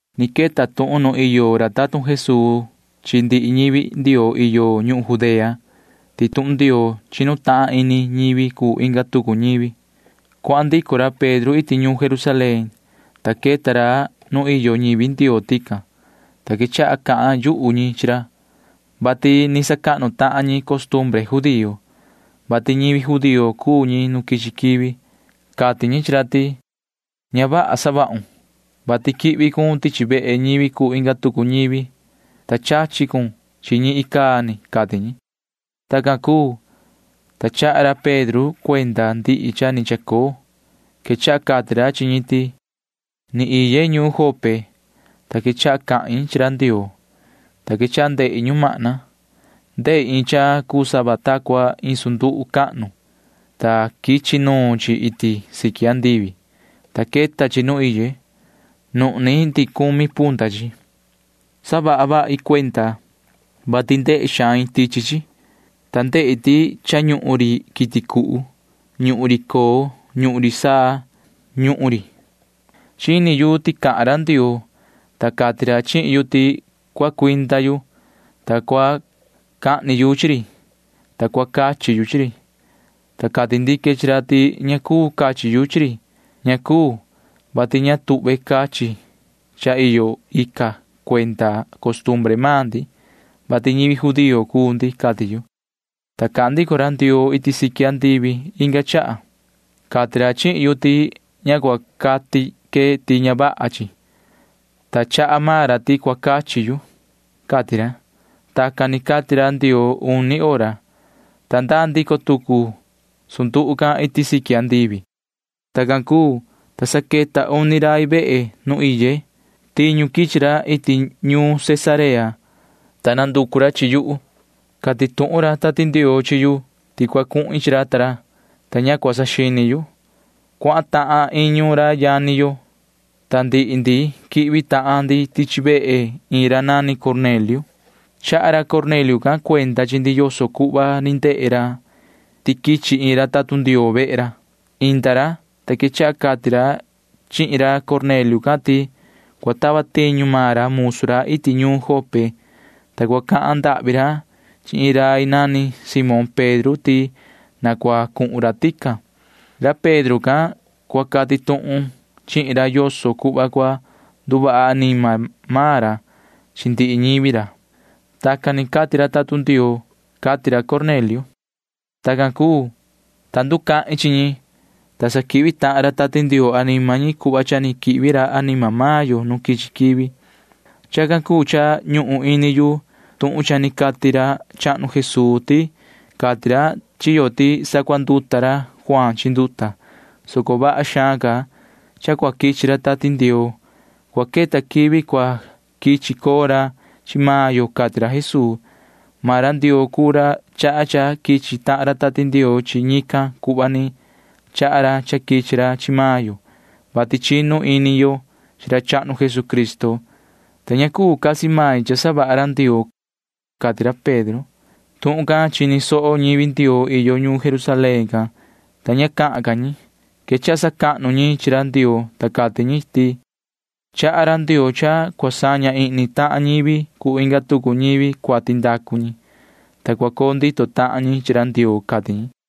Ni queta tuhun nuun iyo ra tatun Jesuu chi ndihi ñivi Ndioo iyo ñuhun Judea ti tuhun Ndioo chinu tahan ini ñivi cuu inga tucu ñivi. Cuahan ndico ra Pedro iti ñuun Jerusalén, ta queta ra nu iyo ñivi Ndioo tican, ta quechaha cahan yuhu ñi chi ra, vati ni sacahnu tahan ñi costumbre judío, vati ñivi judío cuu ñi nu quichi quivi. Cati ñi chi ra ti: ―Ña vaha savahun, vati quihvi cun tichi vehe ñivi cuu inga tucu ñivi, ta chachi cun chi ñi icaa ni ―cati ñi. Tacan cuu, ta chaha ra Pedro cuenda ndihi cha ni chacoo. Quechaha cati ra chi ñi ti: ―Ni iye ñuun Jope, ta quechaha cahin chi ra Ndioo, ta quechaha ndehi ñumahna. Ndehi iin cha cuu sava ta cua iin sunduhu cahnu, ta quichi nuun chi iti siqui andivi, ta queta chi nu iye. Nuhni ndihi cumi punta chi. Saha vahi cuenda, vati ndehe xain tichi chi, ta ndehi ti cha ñuhun ri quiti cuhu. Ñuhun ri coo. Ñuhun ri saa. Ñuhun ri. Chini yu ti cahan ra Ndioo, ta cati ra chihin yu ti cua cuinda yu, ta cua cahni yu chi ri, ta cua cachi yu chi ri, ta cati ndique chi ra ti ña cuu cachi yu chi ri. Ña cuu, vati ña tuhve cachi cha iyo ica cuenda costumbre maan ndi, vati ñivi judío cuu ndi, cati yu, ta cahan ndico ra Ndioo iti siqui andivi inga chaha. Cati ra chihin yu ti ña cua cati que ti ña vaha chi, ta chaha maan ra ti cua cachi yu, cati ra. Tacan ni cati ra Ndioo uni hora, ta ndaa ndico tucu sunduhu can iti siqui andivi. Tacan cuu, ta sa queta uni rai vehe nu iye. Tiñu quichi ra iti ñuun Cesarea, ta nanducu ra chi yuhu. Cati tuhun ra Tati Ndioo chi yu ti cua cuhin chi ra ta ra, ta ña cua saxini yu. Cuahan tahan iñu ra yani yo, ta ndihi ndi quihvi tahan ndi tichi vehe iin ra nani Cornelio. Chaha ra Cornelio can cuenda chi ndi yoso cuhva ni ndehe ra ti quichi iin ra tatun Ndioo vehe ra. Inda ra, ta quechaha cati ra chihin ra Cornelio can ti cua tava tiñu maan ra musu ra iti ñuun Jope, ta cua cahan ndahvi ra chi iin rai nani Simón Pedro ti na cua cuhun ra tican. Ra Pedro can cua cati tuhun chihin ra yoso cuhva cua nduvaha anima maan ra chi ndihi ñivi ra. Tacan ni cati ra tatun Ndioo, cati ra Cornelio. Tacan cuu, ta nducahin chi ñi, ta sa quihvi tahan ra Tati Ndioo anima ñi cuhva cha ni quihvi ra anima maan yo nu quichi quivi. Chacan cuu cha ñuhun ini yu tuhun cha ni cati ra chahnu Jesuu ti cati ra chi yo ti sacuanduta ra Juaan chi nduta, soco vaha xaan ca cha cua quichi ra Tati Ndioo. Cua queta quivi cua quichi coo ra chi maan yo, cati ra Jesuu. Maan ra Ndioo cuu ra chaha cha quichi tahan ra Tati Ndioo chi ñican cuhva ni chaha ra cha quichi ra chi maan yo, vati chinu ini yo chi ra chahnu Jesucristo, ta ña cuu casi main cha savaha ra Ndioo ―cati ra Pedro. Tuhun can chini soho ñivi Ndioo iyo ñuun Jerusalén can, ta ña cahan ca ñi. Quechaha sacahnu ñi chi ra Ndioo, ta cati ñi ti: ―Chaha ra Ndioo cha cua saña ihni tahan ñivi cuu inga tucu ñivi cuati ndacu ñi, ta cua coo ndito tahan ñi chi ra Ndioo ―cati ñi.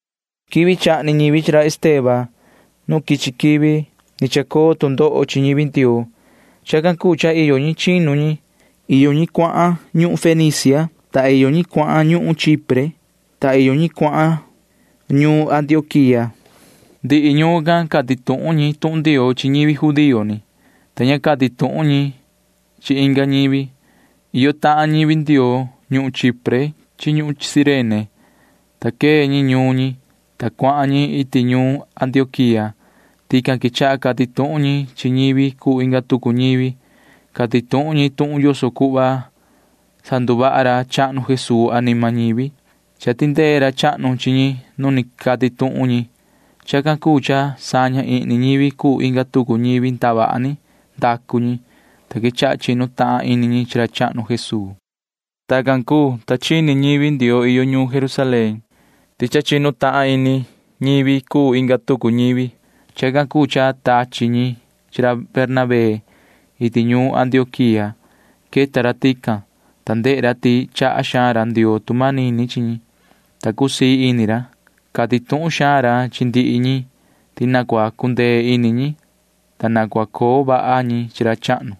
Quivi chahni ñivi chi ra Esteban nu quichi quivi ni chacoo tu ndoho chi ñivi Ndioo. Chacan cuu cha iyo ñi chinu ñi. Iyo ñi cuahan ñuhun Fenicia, ta iyo ñi cuahan ñuhun Chipre, ta iyo ñi cuahan ñuun Antioquía. Ndihi ñuun can cati tuhun ñi tuhun Ndioo chi ñivi judío ni, ta ña cati tuhun ñi chi inga ñivi. Iyo tahan ñivi Ndioo ñuhun Chipre chi ñuhun Cirene, ta quee ñi ñuun ñi, ta cuahan ñi iti ñuun Antioquía. Tican quechaha cati tuhun ñi chi ñivi cuu inga tucu ñivi. Cati tuhun ñi tuhun yoso cuhva sanduvaha ra chahnu Jesuu anima ñivi. Cha tindee ra chahnu chi ñi nu ni cati tuhun ñi. Chacan cuu cha saña ihni ñivi cuu inga tucu ñivi ndavaha ni ndacu ñi, ta quechaha chinu tahan ini ñi chi ra chahnu Jesuu. Tacan cuu, ta chini tuhun ñivi Ndioo iyo ñuun Jerusalén ti cha ni chinu tahan ini ñivi cuu inga tucu ñivi. Chacan cuu cha tachi ñi chi ra Bernabé iti ñuun Antioquía. Queta ra tican, ta ndehe ra ti chaha xaan ra Ndioo tu manini chi ñi, ta cusii ini ra. Cati tuhun xaan ra chi ndihi ñi ti na cua cundee ini ñi, ta na cua coo vaha ñi chi ra chahnu.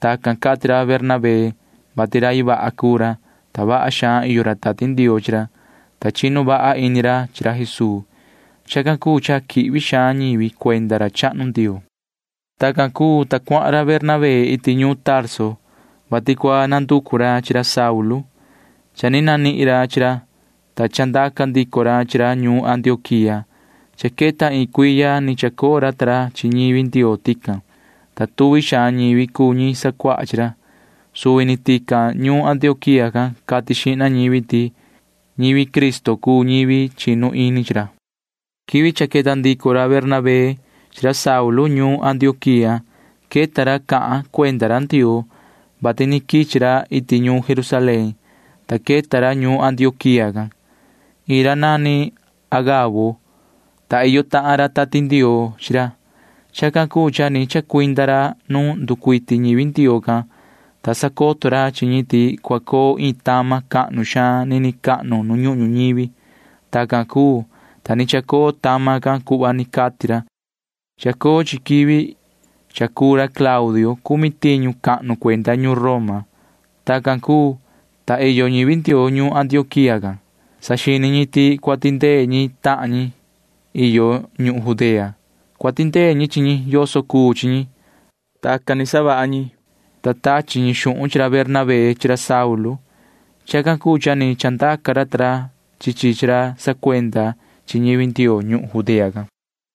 Tacan cati ra Bernabé, vati rai vaha cuu ra, ta vaha xaan iyo ra Tati Ndioo chi ra, ta chinu vaha ini ra chi ra Jesuu. Chacan cuu cha quihvi xaan ñivi cuenda ra chahnu Ndioo. Tacan cuu, ta cuahan ra Bernabé iti ñuun Tarso, vati cua nanducu ra chi ra Saulu. Cha ni nanihin ra chi ra, ta chandaca ndico ra chi ra ñuun Antioquía. Cha queta iin cuiya ni chacoo ra ta ra chi ñivi Ndioo tican, ta tuvi xaan ñivi cuu ñi sacuaha chi ra. Suvi ni tican ñuun Antioquía can cati xihna ñivi ti ñivi Cristo cuu ñivi chinu ini chi ra. Quivi cha queta ndico ra Bernabé chi ra Saulu ñuun Antioquía queta ra cahan cuenda ra Ndioo, vati ni quichi ra iti ñuun Jerusalén, ta queta ra ñuun Antioquía can. Iin ra nani Agabo, ta iyo tahan ra Tati Ndioo chi ra. Chacan cuu cha ni chacuinda ra nu nducuiti ñivi Ndioo can, ta sacoto ra chi ñi ti cua coo iin tama cahnu xaan nini cahnu nu ñuhun ñuñivi. Tacan cuu, ta ni chacoo tama can cuhva ni cati ra. Chacoo chi quivi cha cuu ra Claudio cumi tiñu cahnu cuenda ñuun Roma. Tacan cuu, ta iyo ñivi Ndioo ñuun Antioquía can―saxini ñi ti cua tindee ñi chi tahan ñi iyo ñuhun Judea. Cua tindee ñi chi ñi yoso cuu chi ñi. Tacan ni savaha ñi, ta tachi ñi xuhun chi ra Bernabé chi ra Saulu. Chacan cuu cha ni chandaca ra ta ra chi chi chi ra sacuenda chi ñivi Ndioo ñuhun Judea can.